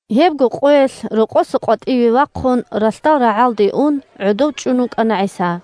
Гьебго къоялъ рокъоса къватӀиве вахъун ралъдал рагӀалде ун гӀодов чӀун вукӀана ГӀиса.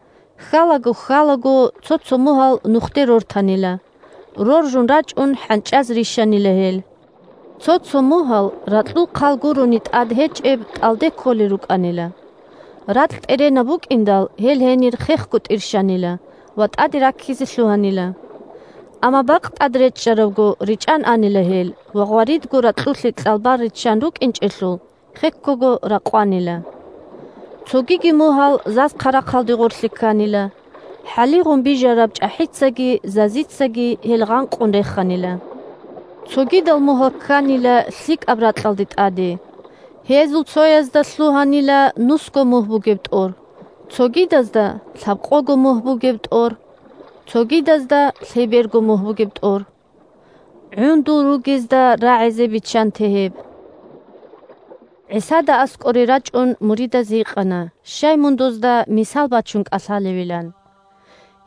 Хьалаго-хьалаго цо-цо мугьал нухде рортанила, роржун рачӀун хӀанчӀаз рищанила гьел. Цо-цо мугьал ракьул хъал гурони тӀад гьечӀеб тӀалде кколел рукӀанила. Ракь тӀеренаб букӀиндал, гьел гьенир хехго тӀирщанила ва тӀаде раккизе лъугьанила. Амма бакъ тӀад речӀчӀарабго речӀан анила гьел ва, гъваридго ракьулъе кьалбал риччан рукӀинчӀелъул, хеккого ракъванила. Цогиги мугьал заз-хъарахъалде гъорлъе кканила, хӀалигъун бижараб чӀахӀицаги зазицаги гьел гъанкъун реханила. Цогидал мугьал кканила лъикӀаб ракьалда тӀаде, гьезул цоязда лъугьанила нусго мугь бугеб тӀор, цогидазда – лъабкъого мугь бугеб тӀор, цогидазда – лъеберго мугь бугеб тӀор. ГӀундул ругезда рагӀизе биччанте гьеб! ГӀисада аскӀоре рачӀун муридаз гьикъана щай мун дозда мисал бачун кӀалъалевилан.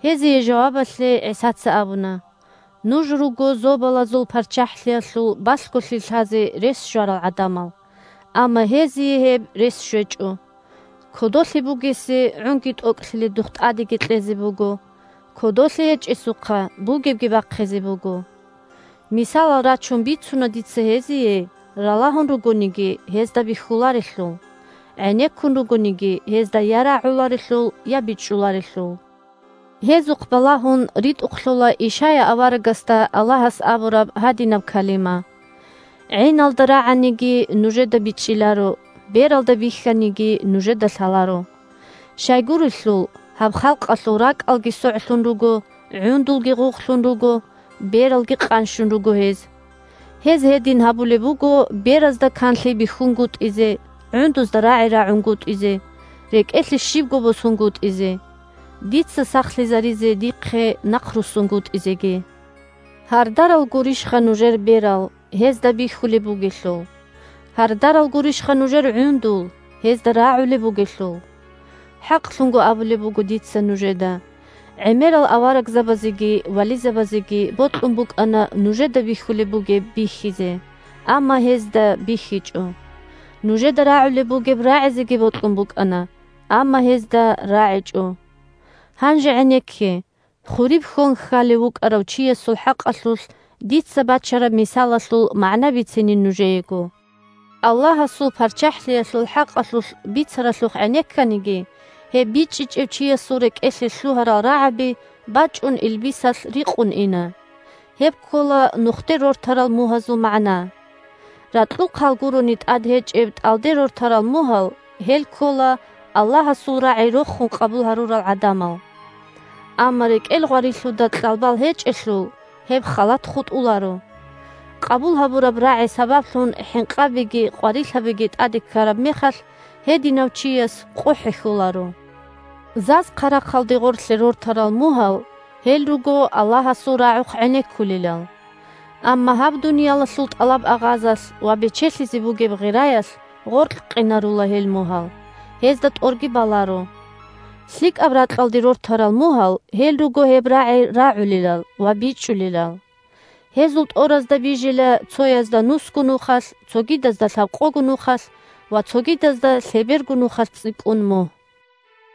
Гьезие жавабалъе ГӀисаца абуна: – Нуж руго Зобалазул ПарччахӀлъиялъул балъголъи лъазе рес щварал гӀадамал, амма гьезие гьеб рес щвечӀо. Кодолъи бугесе гӀунги тӀокӀлъиледухъ тӀадеги кьезе буго, кодолъи гьечӀесухъа бугебги бахъизе буго. Мисалал рачун бицуна дица гьезие, ралагьун ругониги гьезда бихьуларелъул, гӀенеккун ругониги гьезда я рагӀуларелъул, я бичӀчӀуларелъул. Гьезухъ балагьун ритӀухълъула Ишая аварагасда Аллагьас абураб гьадинаб калима: «ГӀиналда рагӀаниги, нужеда бичӀчӀиларо, бералда бихьаниги, нужеда лъаларо. Щайгурелъул гьаб халкъалъул ракӀалги согӀлъун руго, гӀундулги гъугълъун руго, бералги къанщун руго гьез. Гьез гьедин гьабулеб буго беразда канлъи бихьунгутӀизе, гӀундузда рагӀи рагӀунгутӀизе, рекӀелъе щибго босунгутӀизе, дица сахлъизаризе дихъе нахъруссунгутӀизеги». Гьардарал гурищха нужер берал, гьезда бихьулеб бугелъул. Гьардарал гурищха нужер гӀундул, гьезда рагӀулеб бугелъул. ХӀакълъун абулеб буго дица нужеда: гӀемерал аварагзабазеги вализабазеги бокьун букӀана нужеда бихьулеб бугеб бихьизе, амма гьезда бихьичӀо. Нужеда рагӀулеб бугеб рагӀизеги бокьун букӀана, амма гьезда рагӀичӀо. Гьанже гӀенекке, хуриб хьон хьалев вукӀарав чиясул хӀакъалъулъ дица бачараб мисалалъул магӀна бицинин нужеего. Аллагьасул ПарччахӀлъиялъул хӀакъалъулъ бицаралъухъ гӀенекканиги, гьеб бичӀчӀичӀев чиясул рекӀелъе лъугьарал рагӀаби бачӀун илбисалъ рикъун ина. Гьеб ккола нухде рортарал мугьазул магӀна. Ракьул хъал гурони тӀад гьечӀеб тӀалде рортарал мугьал – гьел ккола Аллагьасул рагӀи рохун къабул гьабурал гӀадамал. Амма рекӀел гъварилъуда кьалбал гьечӀелъул, гьеб халат хутӀуларо. Къабул гьабураб рагӀи сабаблъун хӀинкъабиги къварилъабиги тӀаде ккараб мехалъ, гьединав чияс къо хӀехьоларо. Заз-хъарахъалде гъорлъе рортарал мугьал – гьел руго Аллагьасул рагӀухъ гӀенеккулелал. Амма гьаб дуниялалъул тӀалаб-агъазалъ ва бечелъизе бугеб гъираялъ гъоркькъинарула гьел мугьал, гьезда тӀорги баларо. ЛъикӀаб ракьалде рортарал мугьал – гьел руго гьеб рагӀи рагӀулелал ва бичӀчӀулелал. Гьезул тӀоразда бижила цоязда нусго нухалъ, цогидазда лъабкъого нухалъ ва цогидазда лъеберго нухалъ цӀикӀкӀун мугь.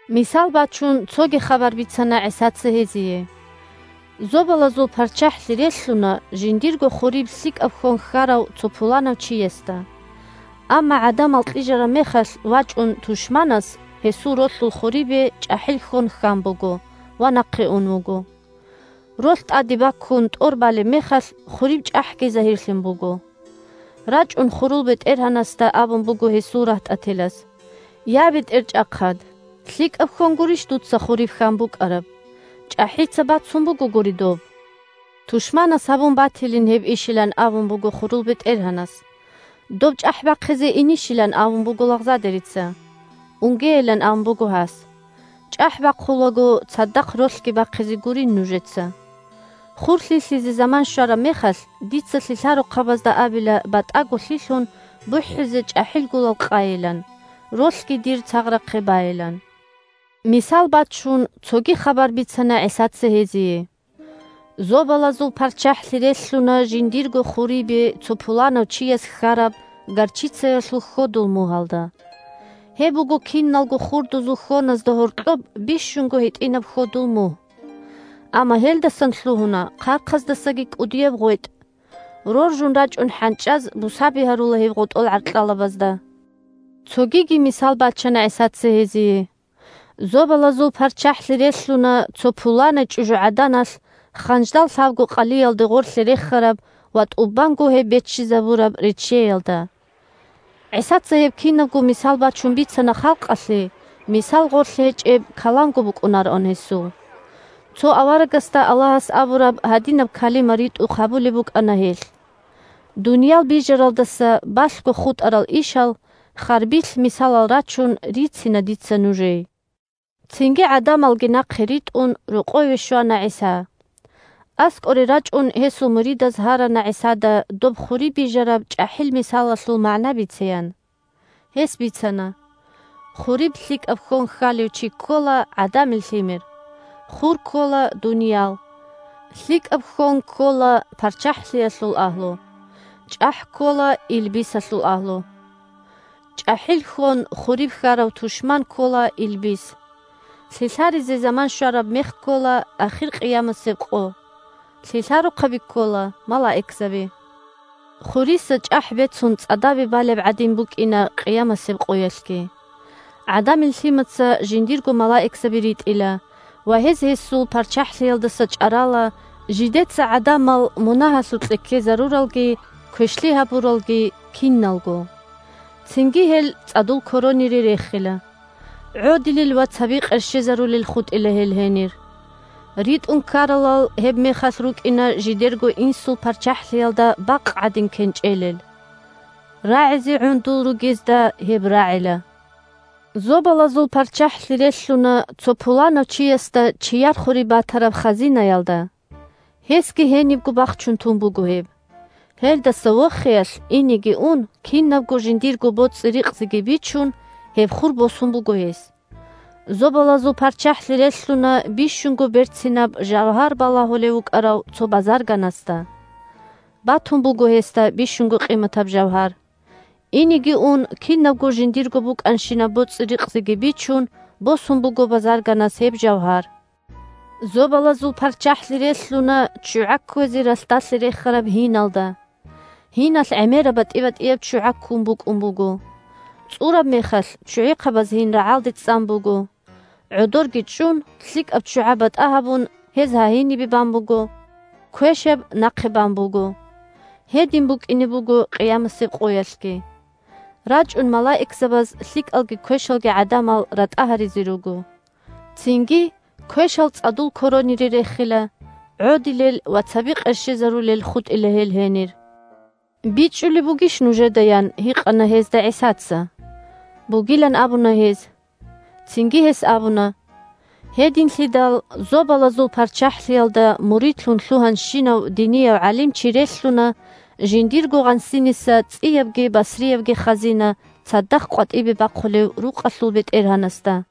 Мисал бачун цоги хабар бицана ГӀисаца гьезие: – Зобалазул ПарччахӀлъи релълъуна жиндирго хуриб лъикӀаб хьон хьарав цо пуланав чиясда. Амма гӀадамал кьижараб мехалъ вачӀун тушманас гьесул ролъул хурибе чӀахӀил хьон хьан буго ва нахъе ун вуго. Ролъ тӀаде баккун, тӀор балеб мехалъ, хуриб чӀахӀги загьирлъун буго. РачӀун хурул бетӀергьанасда абун буго гьесул рагьтӀателаз: – Я, бетӀерчӀахъад, лъикӀаб хьон гурищ дуца хуриб хьан букӀараб? ЧӀахӀица бацун буго гури доб. Тушманас гьабун батилин гьеб ишилан абун буго хурул бетӀергьанас. Доб чӀахӀ бахъизе инищилан абун буго лагъзадерица. Унгейилан абун буго гьас. ЧӀахӀ бахъулаго цадахъ ролъги бахъизе гурин нужеца. Хур лъилъизе заман щвараб мехалъ, дица лъилъарухъабазда абила батӀаго лъилъун, бухӀизе чӀахӀил гулал къайилан, ролъги дир цагърахъе байилан. Мисал бачун, цоги хабар бицана ГӀисаца гьезие: – Зобалазул ПарччахӀлъи релълъуна жиндирго хурибе цо пуланав чияс хьараб горчицаялъул хьодул мугьалда. Гьеб буго киналго хурдузул хьоназда гьоркьоб бищунго гьитӀинаб хьодул мугь. Амма гьелдасан лъугьуна хъархъаздасаги кӀудияб гъветӀ. Роржун рачӀун хӀанчӀаз бусаби гьарула гьеб гъотӀол гӀаркьалабазда. Цогиги мисал бачана ГӀисаца гьезие: – Зобалазул ПарччахӀлъи релълъуна цо пуланай чӀужугӀаданалъ ханждал лъабго къалиялда гъорлъе рехараб ва тӀубанго гьеб беччизабураб реччеялда. ГӀисаца гьеб кинабго мисал бачун бицана халкъалъе, мисал гъорлъ гьечӀеб каламго букӀунароан гьесул. Цо аварагасда Аллагьас абураб гьадинаб калима ритӀухъ гьабулеб букӀана гьелъ: «Дунял бижаралдаса балъго хутӀарал ишал, Харбилъ мисалал рачун, рицина дица нужей». Цинги, гӀадамалги нахъе ритӀун, рокъове щвана ГӀиса. АскӀоре рачӀун гьесул муридаз гьарана ГӀисада доб хуриб бижараб чӀахӀил мисалалъул магӀна бицеян. Гьес бицана: – Хуриб лъикӀаб хьон хьалев чи ккола ГӀадамил Лъимер. Хур ккола дуниял. ЛъикӀаб хьон ккола ПарччахӀлъиялъул агьлу. ЧӀахӀ ккола илбисалъул агьлу. ЧӀахӀил хьон хуриб хьарав тушман ккола илбис. Лъилъаризе заман щвараб мех ккола ахир къиямасеб къо. Лъилъарухъаби ккола малаикзаби. Хуриса чӀахӀ бецун цӀадабе балеб гӀадин букӀина къиямасеб къоялъги. ГӀадамил Лъимаца жиндирго малаикзаби ритӀила, ва гьез гьесул ПарччахӀлъиялдаса чӀарала жидеца гӀадамал мунагьалъукье ккезаруралги квешлъи гьабуралалги – киналго. Цинги гьел цӀадул коронире рехила. ГӀодилел ва цаби къерщезарулел хутӀила гьел гьенир. РитӀун ккаралал гьебмехалъ рукӀина жидерго Инсул ПарччахӀлъиялда бакъ гӀадин кенчӀелел. РагӀизе гӀундул ругезда гьеб рагӀила! Зобалазул ПарччахӀлъи релълъуна цо пуланав чиясда чияр хуриб батараб хазинаялда. Гьесги гьенибго бахчун тун буго гьеб. Гьелдаса вохиялъ, инеги ун, кинабго жиндирго боцӀи-рикъзиги бичун, гьеб хур босун буго гьес. Зобалазул ПарччахӀлъи релълъуна бищунго берцинаб жавгьар балагьулев вукӀарав цо базарганасда. Батун буго гьесда бищунго къиматаб жавгьар. Инеги ун, кинабго жиндирго букӀанщинаб боцӀи-рикъзиги бичун, босун буго базарганас гьеб жавгьар. Зобалазул ПарччахӀлъи релълъуна ччугӀа кквезе ралъдалъе рехараб гьиналда. Гьиналъ гӀемераб батӀи-батӀияб ччугӀа ккун букӀун буго. ЦӀураб мехалъ ччугӀихъабаз гьин рагӀалде цӀан буго. ГӀодорги чӀун, лъикӀаб ччугӀа батӀа гьабун гьез гьагьинибе бан буго, квешаб нахъе бан буго. Гьедин букӀине буго къиямасеб къоялъги. РачӀун малаикзабаз лъикӀалги квешалги гӀадамал ратӀа гьаризе руго. Цинги квешал цӀадул коронире рехила. ГӀодилел ва цаби къерщезарулел хутӀила гьел гьенир. БичӀчӀулеб бугищ нужеда? – ян гьикъана гьезда ГӀисаца. Бугилан абуна гьез. Цинги гьес абуна: – Гьединлъидал Зобалазул ПарччахӀлъиялда муридлъун лъугьанщинав динияв гӀалимчи релълъуна жиндирго гъансиниса цӀиябги басриябги хазина цадахъ къватӀибе бахъулев рукъалъул бетӀергьанасда.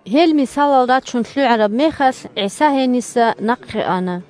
Гьел мисалал рачун лъугӀараб мехалъ, ГӀиса гьениса нахъе ана.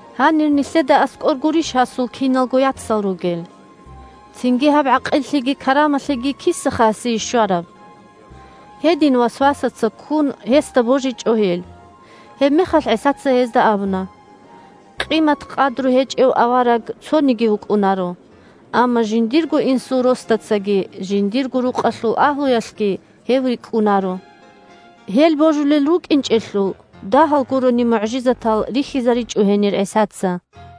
Гьанир нилъеда аскӀор гурищ гьасул киналго яцал ругел? Цинги гьаб гӀакъиллъиги карамалъиги кисаха гьасие щвараб? Гьедин, васвасаца ккун, гьесда божичӀо гьел. Гьебмехалъ ГӀисаца гьезда абуна: – Къимат-къадру гьечӀев авараг цониги вукӀунаро, амма жиндирго инсул росдацаги, жиндирго рукъалъул агьлуялъги гьев рикӀкӀунаро. Гьел божулел рукӀинчӀелъул, дагьал гурони мугӀжизатал рихьизаричӀо гьенир ГӀисаца.